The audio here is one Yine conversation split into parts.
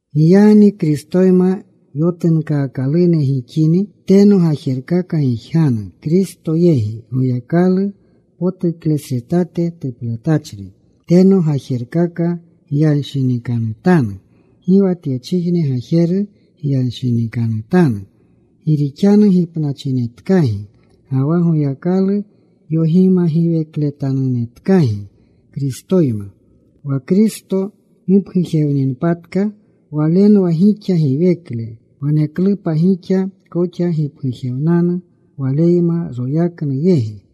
Giyagni Kristoyma yotunkaakalune gixini, teno gajerkaka gijganu, Kristo yegi, Goyakalu potuklesretate tuplatachri. Teno gajerkaka gyanshinikanutanu. Gi wa tyechijne gajeru gyanshinikanutanu. Gi rixanu gipnachinetkagi ga wa Goyakalu yogimagiwekletanunetkagi Kristoyma. Wa Kristo gipgujewninpatka, Walenwa gixa giwekle, waneklupa gixa koxa gipgujewnanu Waleyma royaknu yegi.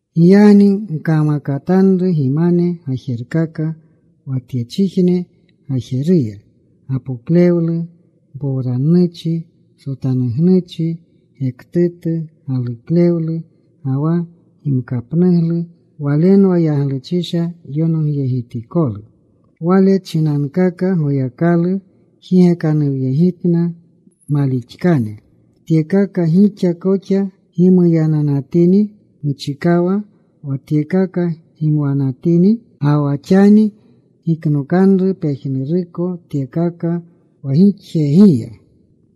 Giyagni gkamakatanru gimane gajerkaka wa tyechijne gajeruya; gapoklewlu, mpowrannuchi, sotanugnuchi, gektutu galuklewlu, ga wa gimkapnuglu. Walenwa yagluchisha yonogyegitikolu. Wale chinankaka Goyakalu jigekanuwyegitna malixaklene. Tyekaka gixa koxa gimuyananatini muchikawa, wa tyekaka gimwanatini. Ga wa xani giknokanru pejnuruko tyekaka wa gixyegiya: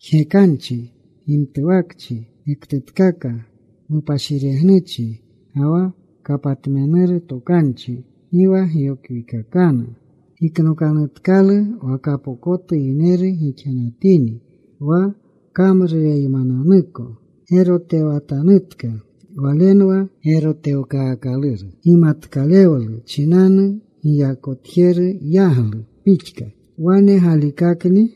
jgekanchi, gimtuwakchi, gektutkaka, mupashiregnuchi, ga wa kapatmenuru tokanchi. Gi wa gyokwikakanu. Giknokanutkalu wa kapokotu yineru gixanatini wa kamrureymananuko. Gerotewatanutka. Walenwa gerotewkaakaluru gimatkalewlu chinanu, giyakotjeru yaglu pixka. Wane galikakni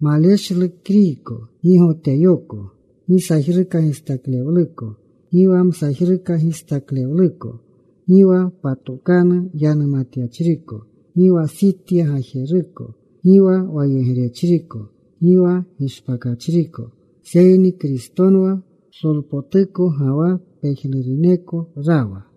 maleshlu Kriyko, gi Goteyoko, gi sajruka gistaklewluko, gi wa msajruka gistaklewluko, gi wa patokanu yanumatyachriko, gi wa Sitya gajeruko, gi wa wayegrechriko, gi wa gishpakachriko. Seyni Kristonwa psolpotuko, ga wa pejnuruneko rawa.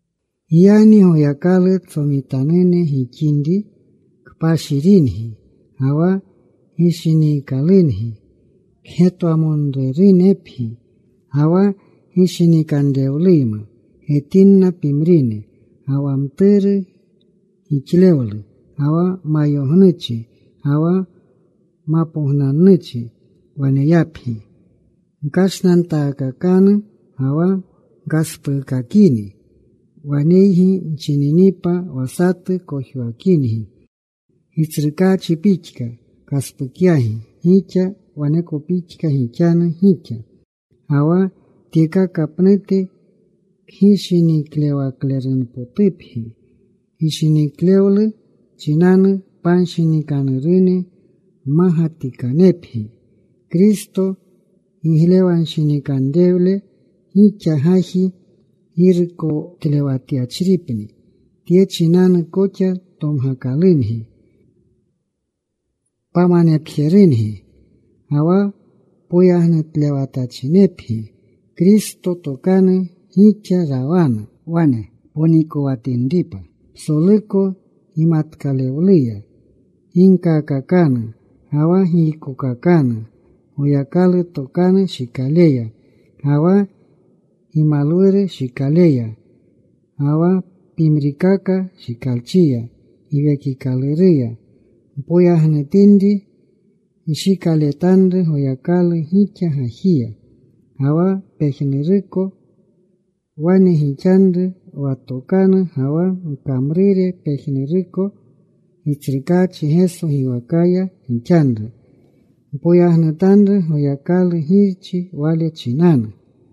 Giyagni Goyakalu tsomitanune gixinri kpashiringi ga wa gishiniikalungi, kgetwamonrerunepgi, ga wa gishinikanrewluyma getinna pimrine. Ga wa mturu gixlewlu, ga wa mayognuchi, ga wa mapognannuchi waneyapgi. Gkashnantaakakanu ga wa gkaspuukakini waneygi nchininipa wa satu kojwakingi. Gitsrukaachi pixka kaspukyagi gixa, waneko pixka gixanu gixa. Ga wa tyekaka pnute kgishiniklewaklerunpotupgi. Gishiniklewlu chinanu panshinikanurune mmagatikanepgi. Kristo giglewanshinikanrewle gixa gaji girukotlewatyachripni. Tye chinanu koxa tomgakalungi pamanepjerungi. Ga wa poyagnutlewatachinepgi. Kristo tokanu gixa rawanu. Wane ponikowatinripa psoluko gimatkalewluya. Ginkakakanu ga wa giykokakanu Goyakalu tokanu shikaleya, ga wa gimalwuru shikaleya, ga wa pimrikaka shikalchiya Giwekikaluruya. Mpoyagnutinri nshikaletanru Goyakalu gixa gajiya. Ga wa pejnuruko wane gixanru wa ntokanu ga wa gkamrure pejnuruko Gitsrukaachi Geso giwakaya gixanru. Mpoyagnutanru Goyakalu Girchi wale chinanu.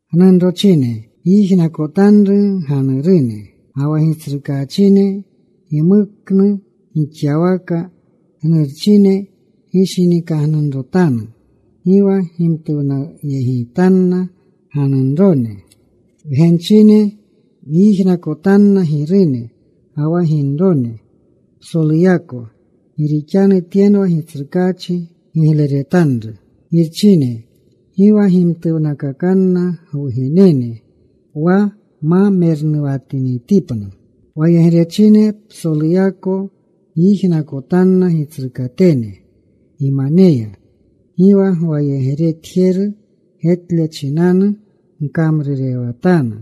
Gnunrochine, gyijnakotanru gganurune wa Gitsrukaachinune gimuknu gixyawaka. Gnurchine, gishinikagnunrotanu. Gi wa gimtuwnayegitanna ganunrone. Wgenchine, gyijnakotanna girune ga wa ginrone psoluyako, gi rixanu tyenwa Gitsrukaachi gigleretanru. Girchine, gi wa gimtuwnakakanna gwugenene, wa ma mernuwatinitipna. Wayegrechine, psoluyako gyijnakotanna gitsrukatene gimaneya. Gi wa gwayegretjeru getle chinanu gkamrurewatanu,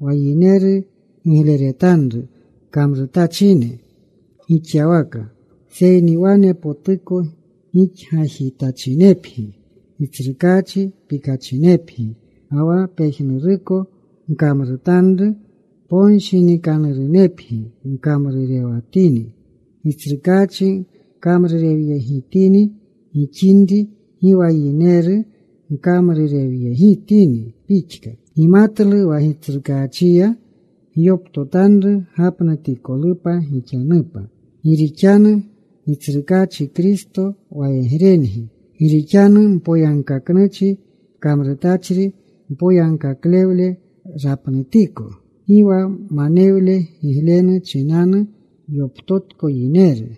wa yineru gigleretanru kamrutachine gixyawaka. Seyni wane potuko gixgajitachinepgi, Gitsrukaachi pikachinepgi. Ga wa pejnuruko gkamrutanru, ponshinikanurunepgi gkamrurewatini, Gitsrukaachi gkamrurewyegitini gixinri. Gi wa yineru gkamrurewyegitini pixka. Gimatlu wa Gitsrukaachiya gyoptotanru gapnutikolupa gixanupa. Gi rixanu Gitsrukaachi Kristo wayegrengi. Gi rixanu mpoyagkaknuchi kamrutachri, mpoyagkaklewle rapnutiko. Gi wa manewlu giglenu chinanu yoptotko yineru.